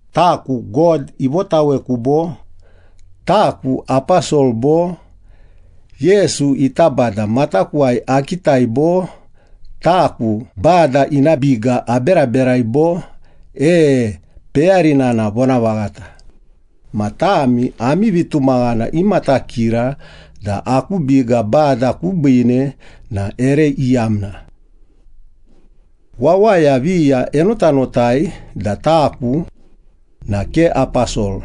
Taku God ivotaweku bo? Taku aposol bo? Yesu ita Bada matakuwai akitai bo? Taku Bada ina biga aberaberai bo? E, peyarina na vonavaghata. Ma tami ami vitumaghana imatakira da aku biga Bada kubiine na ere iyamna. Wawaya viya enotanotai da taku na ke aposol.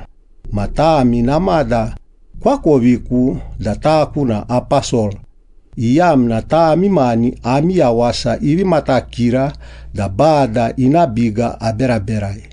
Ma tami namada koakoviku da taku na aposol, iyamna tami mani ami yawasa ivi matakira da Bada ina biga aberaberai.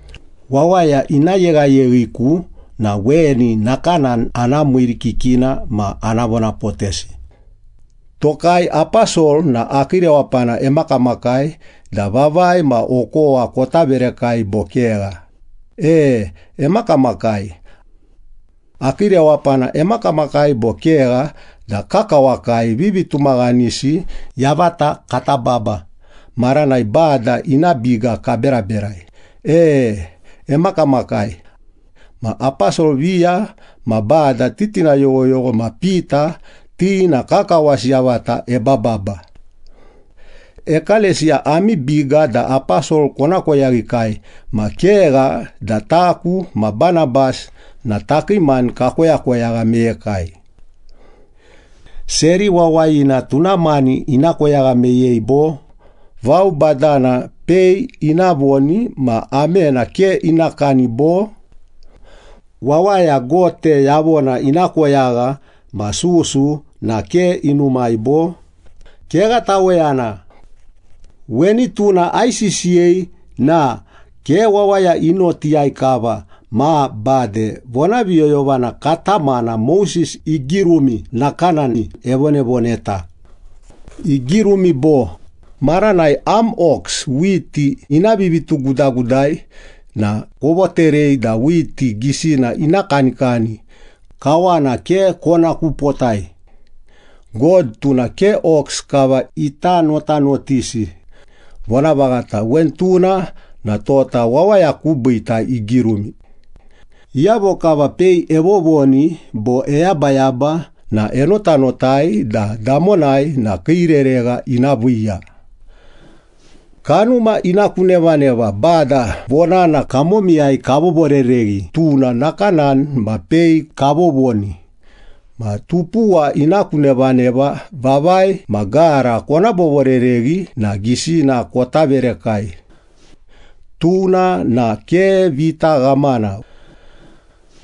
Wawaya ina yeghayeghiku na weni nakanani ana miirikikina ma ana vonapotesi. Tokai aposol na akii rewapana emakamakai da vavai ma okowa kota verekai, bo kegha? E, emakamakai. Akii rewapana emakamakai bo kegha da kakawakai vivitumaghanisi yavata kata baba maranai Bada ina biga kaberaberai? E, emakamakai. Ma aposol viya ma Bada titina yoghoyogho ma Pita, ti na kakawasi yavata ebababa. Ekalesiya ami biga da aposol kona koyaghikai ma kegha da taku ma Banabas na takii mani kakoyakoyagha meyekai. Seri wawayina tuna mani ina koyagha meyei bo? Vao badana pei ina voni ma amena ke ina kani bo? Wawaya gote yavona ina koyagha ma susu na ke inumai bo? Kegha taweyana. Weni tuna aisisiyei na ke wawaya i notiyai kava ma bade vonaviyoyovana katamana Moses igirumi nakanani evonavoneta. Igirumi bo, “Maranai am ox whiti ina vivitugudagudai na kovoterei da whiti gisina ina kanikani, kawana ke kona kupotai.” God tuna ke ox kava ita notanotisi. Vonavaghata weni tuna na tota wawaya kubiita igirumi. Iyavo kava pei evovoni bo eyabayaba na enotanotai da damonai na kii reregha ina viiya. Kanuma ina ku nevaneva Bada vonana kamomiyai kavovorereghi, tuna nakanani ma pei kavovoni. Ma tupuwa ina ku nevaneva, vavai ma gara kona vovorereghi na gisina kota verekai. Tuna na ke vita ghamana.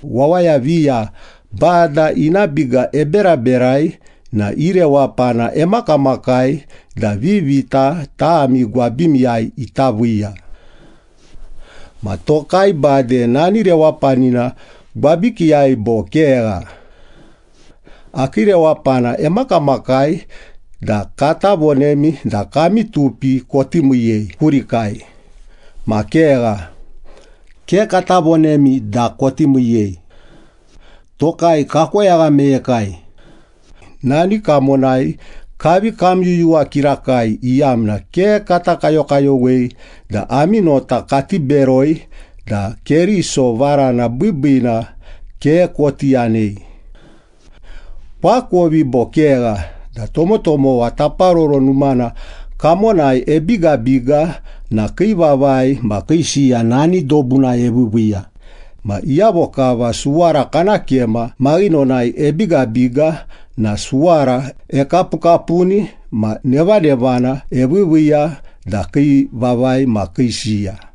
Wawaya viya Bada ina biga eberaberai na i rewapana emakamakai da vivita tami gwabimiyai ita viiya. Ma tokai bade nani rewapanina gwabikiiyai bo kegha? Akii rewapana emakamakai da kata vonemi da kami tupi koti miiyei kurikai, ma kegha, ke kata vonemi da koti miiyei. Tokai kakoyagha meyekai. Nani kamonai kavi kamyuyuwa kirakai, iyamna ke kata kayokayowei da ami nota kati beroi da Keriso varana biibiina ke koti yanei. Koakovi bo kegha da tomotomowa Taparoro Numana kamonai ebigabiga na kii vavai ma kii siya nani dobunai eviiviiya, ma iyavo kava suwara kana kema maghinonai ebigabiga na suwara ekapukapuni ma nevanevana eviiviiya da kii vavai ma kii siya.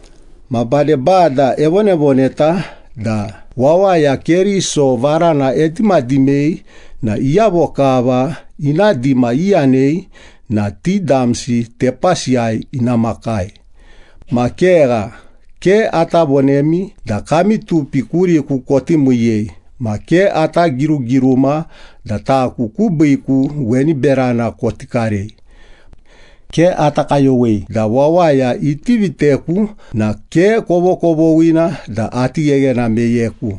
Ma bade, Bada evonavoneta da wawaya Keriso varana edimadimei na iyavo kava ina dima iyanei na ti damsi tepasiyai ina makai. Ma kegha, ke ata vonemi da kami tupi kuriku koti miiyei, ma ke ata girugiruma da taku kubiiku weni berana koti karei. Ke ata kayowei da wawaya iti viteku, iyamna iti viteku na ke kovokovoghina da ati gheghena meyeku.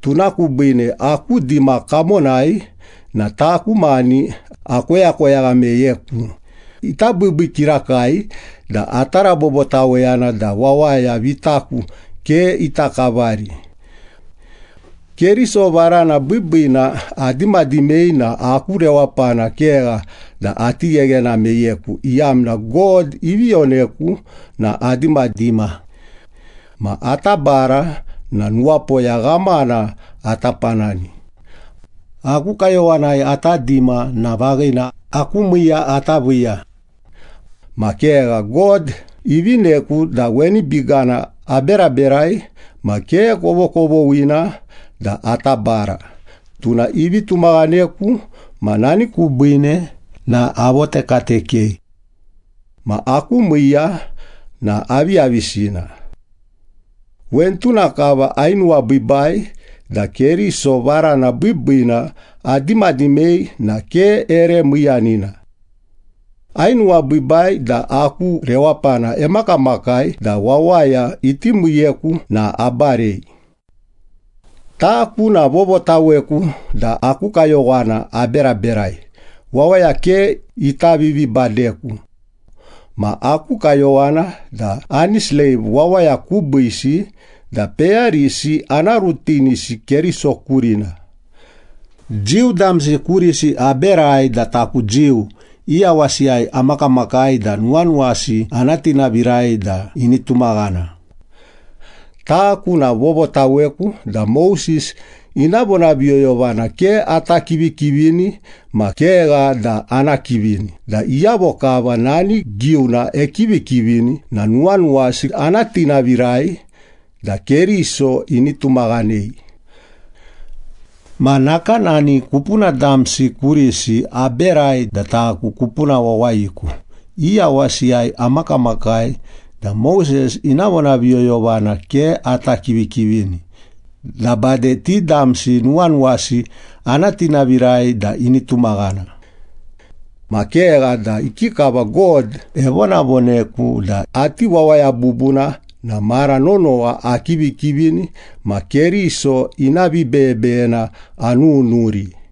Tuna kubiine aku dima kamonai na taku mani akoyakoyagha meyeku. Ita biibii kirakai da ata rabobotaweyana da wawaya vitaku ke ita kavari! Keriso varana biibiina adimadimei na aku rewapana kegha da ati gheghena meyeku, iyamna God ivi yoneku na adimadima. Ma ata bara na nuwapoya ghamana ata panani. Aku kayowanai ata dima na vaghina, aku miiya ata viiya. Ma kegha, God ivineku da weni bigana aberaberai ma ke kovokovoghina da ata bara. Tuna ivi tumaghaneku ma nani kubiine na avotekatekei. Ma aku miiya na aviyavisina? Weni tuna kava, ainuwabiibai da Keriso varana biibiina adimadimei na ke ere miiyanina. Ainuwabiibai da aku rewapana emakamakai da wawaya iti miiyeku na abarei. Taku na vovotaweku da aku kayowana aberaberai, wawaya ke ita vivibadeku. Ma aku kayowana da ani sleiv wawaya kubiisi da peyarisi ana rutinisi Keriso kurina. Jiu damsi kurisi aberai da taku Jiu, i yawasiyai amakamakai da nuwanuwasi ana tinavirai da ini tumaghana. Taku na vovotaweku da Moses ina vonaviyoyovana ke ata kivikivini ma kegha da ana kivini da iyavo kava nani giuna ekivikivini na nuwanuwasi ana tinavirai da Keriso ini tumaghanei. Ma nakanani kupuna damsi kurisi aberai da taku kupuna wawayiku, i yawasiyai amakamakai da Moses ina vonaviyoyovana ke ata kivikivini, da bade ti damsi nuwanuwasi ana tinavirai da ini tumaghana. Ma kegha da ikikava God evonavoneku da ati wawaya bubuna na mara nonowa akivikivini ma Keriso ina vibeyebeyena anununuri.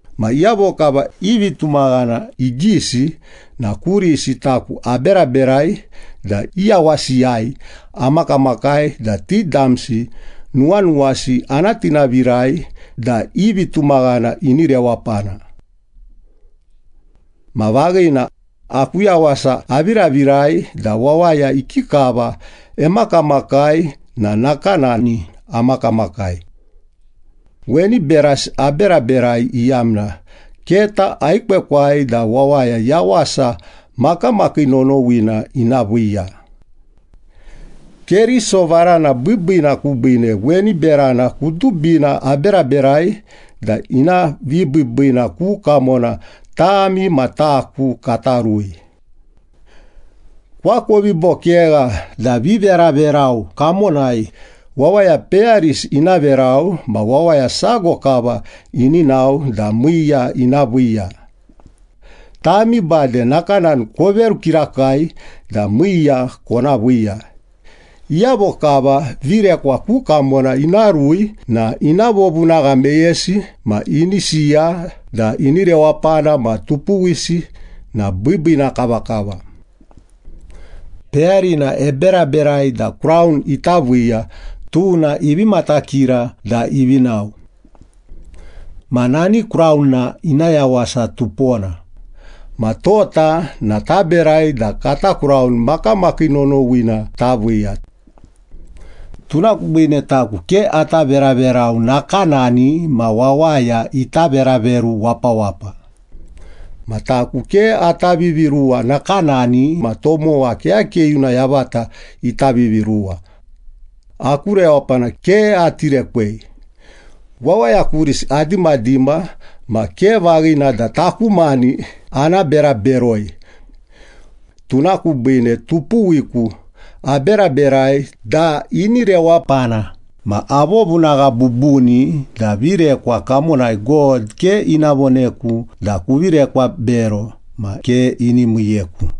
Ma iyavo kava i vitumaghana igisi na kurisi taku aberaberai da i yawasiyai amakamakai da ti damsi nuwanuwasi ana tinavirai da i vitumaghana ini rewapana. Ma vaghina, aku yawasa aviravirai da wawaya ikikava emakamakai na nakanani amakamakai. Weni berasi aberaberai, iyamna keta aekwekwai da wawaya yawasa makamakii nonowina ina viiya. Keriso varana biibiina kubiine weni berana kudubina aberaberai da ina vibiibiina ku kamona tami ma taku kata rui. Koakovi bo kegha da viveraverau kamonai, wawaya peyarisi ina verau ma wawaya sago kava ini nao da miiya ina viiya. Tami bade nakanani koveru kirakai da miiya kona viiya. Iyavo kava virekwa ku kamona ina rui na ina vovunagha meyesi ma ini siya da ini rewapana ma tupuwisi na biibiina kavakava. Peyarina eberaberai da kraun ita viiya, tuna ivi matakira da ivi nao. Ma nani kraun na ina yawasa tupona. Ma tota na taberai da kata kraun makamakii nonowina taviiya. Tuna kubiine taku ke ata veraverau nakanani ma wawaya ita veraveru wapawapa. Ma taku ke ata viviruwa nakanani ma tomowa keyakeyuna yavata ita viviruwa. Aku rewapana ke ati rekwei. Wawaya kurisi adimadima ma ke vaghina da taku mani ana bera beroi. Tuna kubiine tupuwiku aberaberai da ini rewapana ma avovunagha bubuni da virekwa kamonai God ke ina voneku da ‘kuvi rekwa bero’ ma ke ini miiyeku.